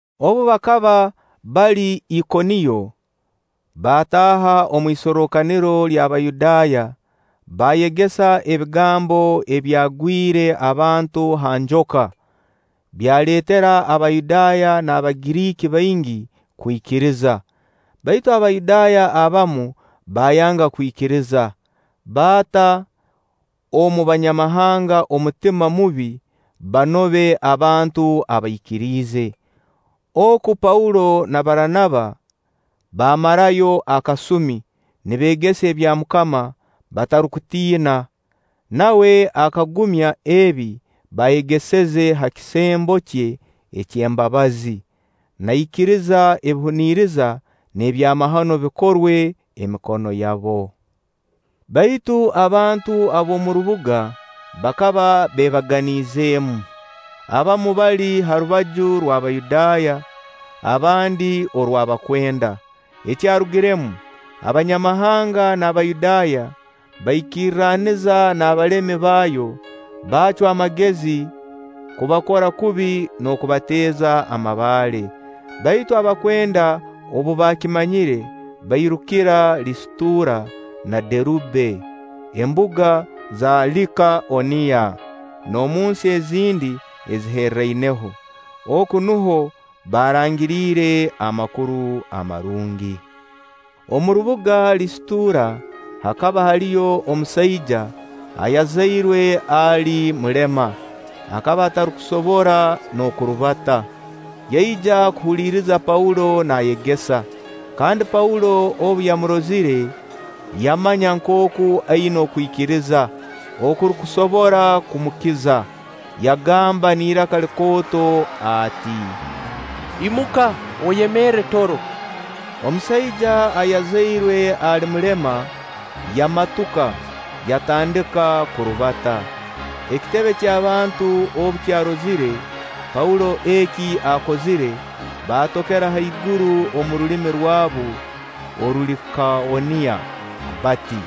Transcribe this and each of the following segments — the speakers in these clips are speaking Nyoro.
Obu bakaba bali Ikoniyo, baataaha omu isorrokaniro ly'Abayudaaya, baayegesa ebigambo ebyagwire abantu ha njoka, byaleetera Abayudaaya n'Abagiriiki baingi kwikiriza. Baitu Abayudaaya abamu baayanga kwikiriza, baata omu Banyamahanga omutima mubi banobe abantu abaikiriize. Oku Paulo na Baranaba baamarayo akasumi, nibeegesa ebya MUKAMA batarukutiina, nawe akagumya ebi baayegeseze ha kisembo kye ky'embabazi, naikiriza ebihuniriza n'ebyamahano bikorwe emikono yabo. Baitu abantu ab'omu rubuga bakaba beebaganizeemu; abamu bali ha rubaju rw'Abayudaaya, abandi orw'abakwenda. Ekyarugiremu, Abanyamahanga n'Abayudaaya baikirraniza n'abalemi baayo, baacwa amagezi kubakora kubi n'okubateeza amabaale. Baitu abakwenda obu baakimanyire, bairukira Lisitura na Derube, embuga za Likaoniya, n'omunsi ezindi eziherraineho. Oku nuho baarangiriire Amakuru Amarungi. Omu rubuga Lisitura hakaba haliyo omusaija ayazairwe ali mulema; akaba atarukusobora n'okurubata. Yaija kuhuliriza Paulo naayegesa; kandi Paulo obu yamurozire, yamanya nkooku aina okwikiriza okurukusobora kumukiza. Yagamba n'iraka likooto ati; “Imuka, oyemerre toro.” Omusaija ayazairwe ali mulema yamatuka, yatandika kurubata. Ekitebe ky'abantu obu kyarozire Paulo eki akozire, baatokera haiguru omu rulimi rwabu Orulikaoniya bati: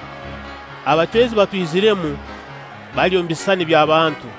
“Abacwezi batwiziremu, bali omu bisisani by'abantu!”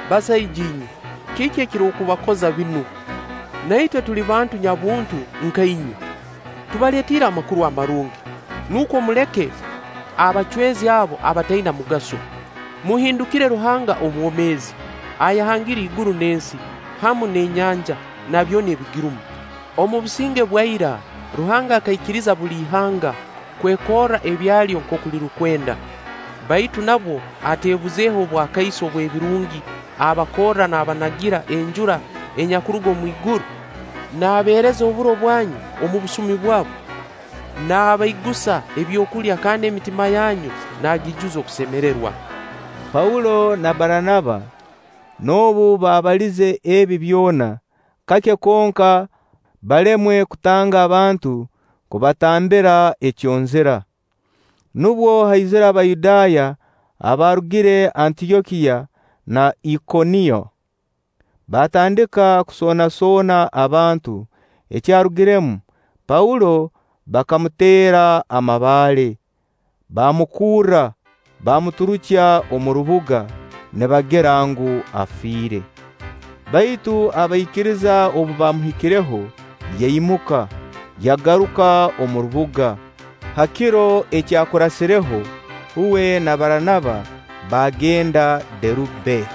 “Basaija inywe, kiki ekirukubakoza binu? Na itwe tuli bantu nyabuntu nka inywe. Tubaleetiire Amakuru Amarungi, nukwo muleke abacwezi abo abataina mugaso, muhindukire Ruhanga omwomeezi, ayahangire iguru n'ensi, hamu n'enyanja, na byona ebigirumu. Omu businge bwa ira Ruhanga akaikiriza buli ihanga kwekorra ebyalyo nkooku lirukwenda; baitu nabwo ateebuzeeho obwakaiso obw'ebirungi abakorra naabanagira enjura enyakuruga omwiguru, naabeereza oburo bwanyu omu busumi bwabwo, naabaigusa ebyokulya kandi emitima yanyu naagiijuza okusemererwa.” Paulo na Baranaba noobu baabaliize ebi byona, kake konka balemwe kutanga abantu kubatambira ekyonzira. Nubwo haizire Abayudaaya abaarugire Antyokiya na Ikoniyo. Baatandika kusoonasoona abantu. Ekyarugiremu, Paulo bakamuteera amabaale, baamukurra, baamuturukya omu rubuga, nibagira ngu, afiire. Baitu abaikiriza obu baamuhikireho, yaimuka, yagaruka omu rubuga. Ha kiro egyakurasireho, uwe na Baranaba baagenda Derube.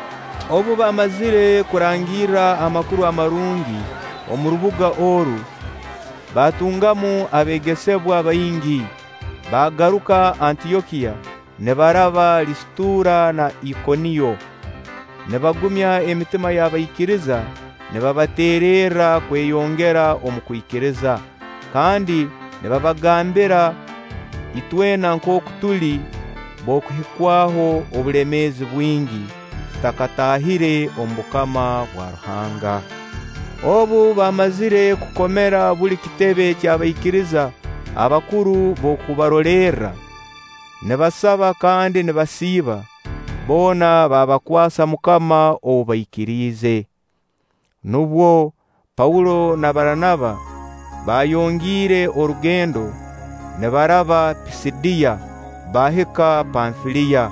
Obu baamazire kurangirra Amakuru Amarungi omu rubuga oru, baatungamu abeegesebwa baingi, baagaruka Antyokiya nibaraba Lisitura na Ikoniyo, nibagumya emitima y'abaikiriza nibabateererra kweyongera omu kwikiriza, kandi nibabagambira itwena nkooku tuli b'okuhikwaho obulemeezi bwingi tutakataahire omu bukama bwa Ruhanga. Obu baamazire kukomera buli kitebe ky'abaikiriza abakuru b'okubarolerra, nibasaba kandi nibasiiba, boona baabakwasa MUKAMA ou baikiriize. Nubwo Paulo na Baranaba baayongiire orugendo nibaraba Pisidiya, baahika Panfiliya.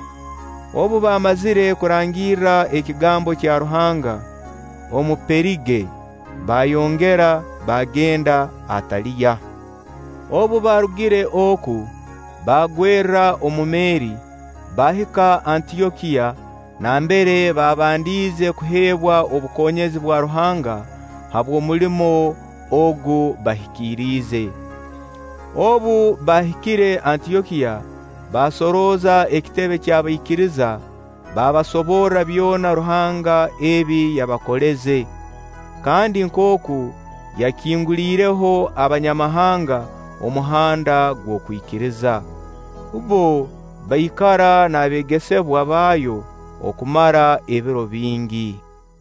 Obu baamazire kurangirra ekigambo kya Ruhanga omu Perige, baayongera baagenda Ataliya. Obu baarugire oku, baagwerra omu meeri, baahika Antyokiya nambere baabandiize kuheebwa obukonyezi bwa Ruhanga habw'omulimo ogu bahikiriize. Obu baahikire Antyokiya, baasorooza ekitebe ky'abaikiriza, baabasoborra byona Ruhanga ebi yabakoleze, kandi nkooku yakinguliireho Abanyamahanga omuhanda gw'okwikiriza. Bbo baikara n'abeegesebwa baayo okumara ebiro bingi.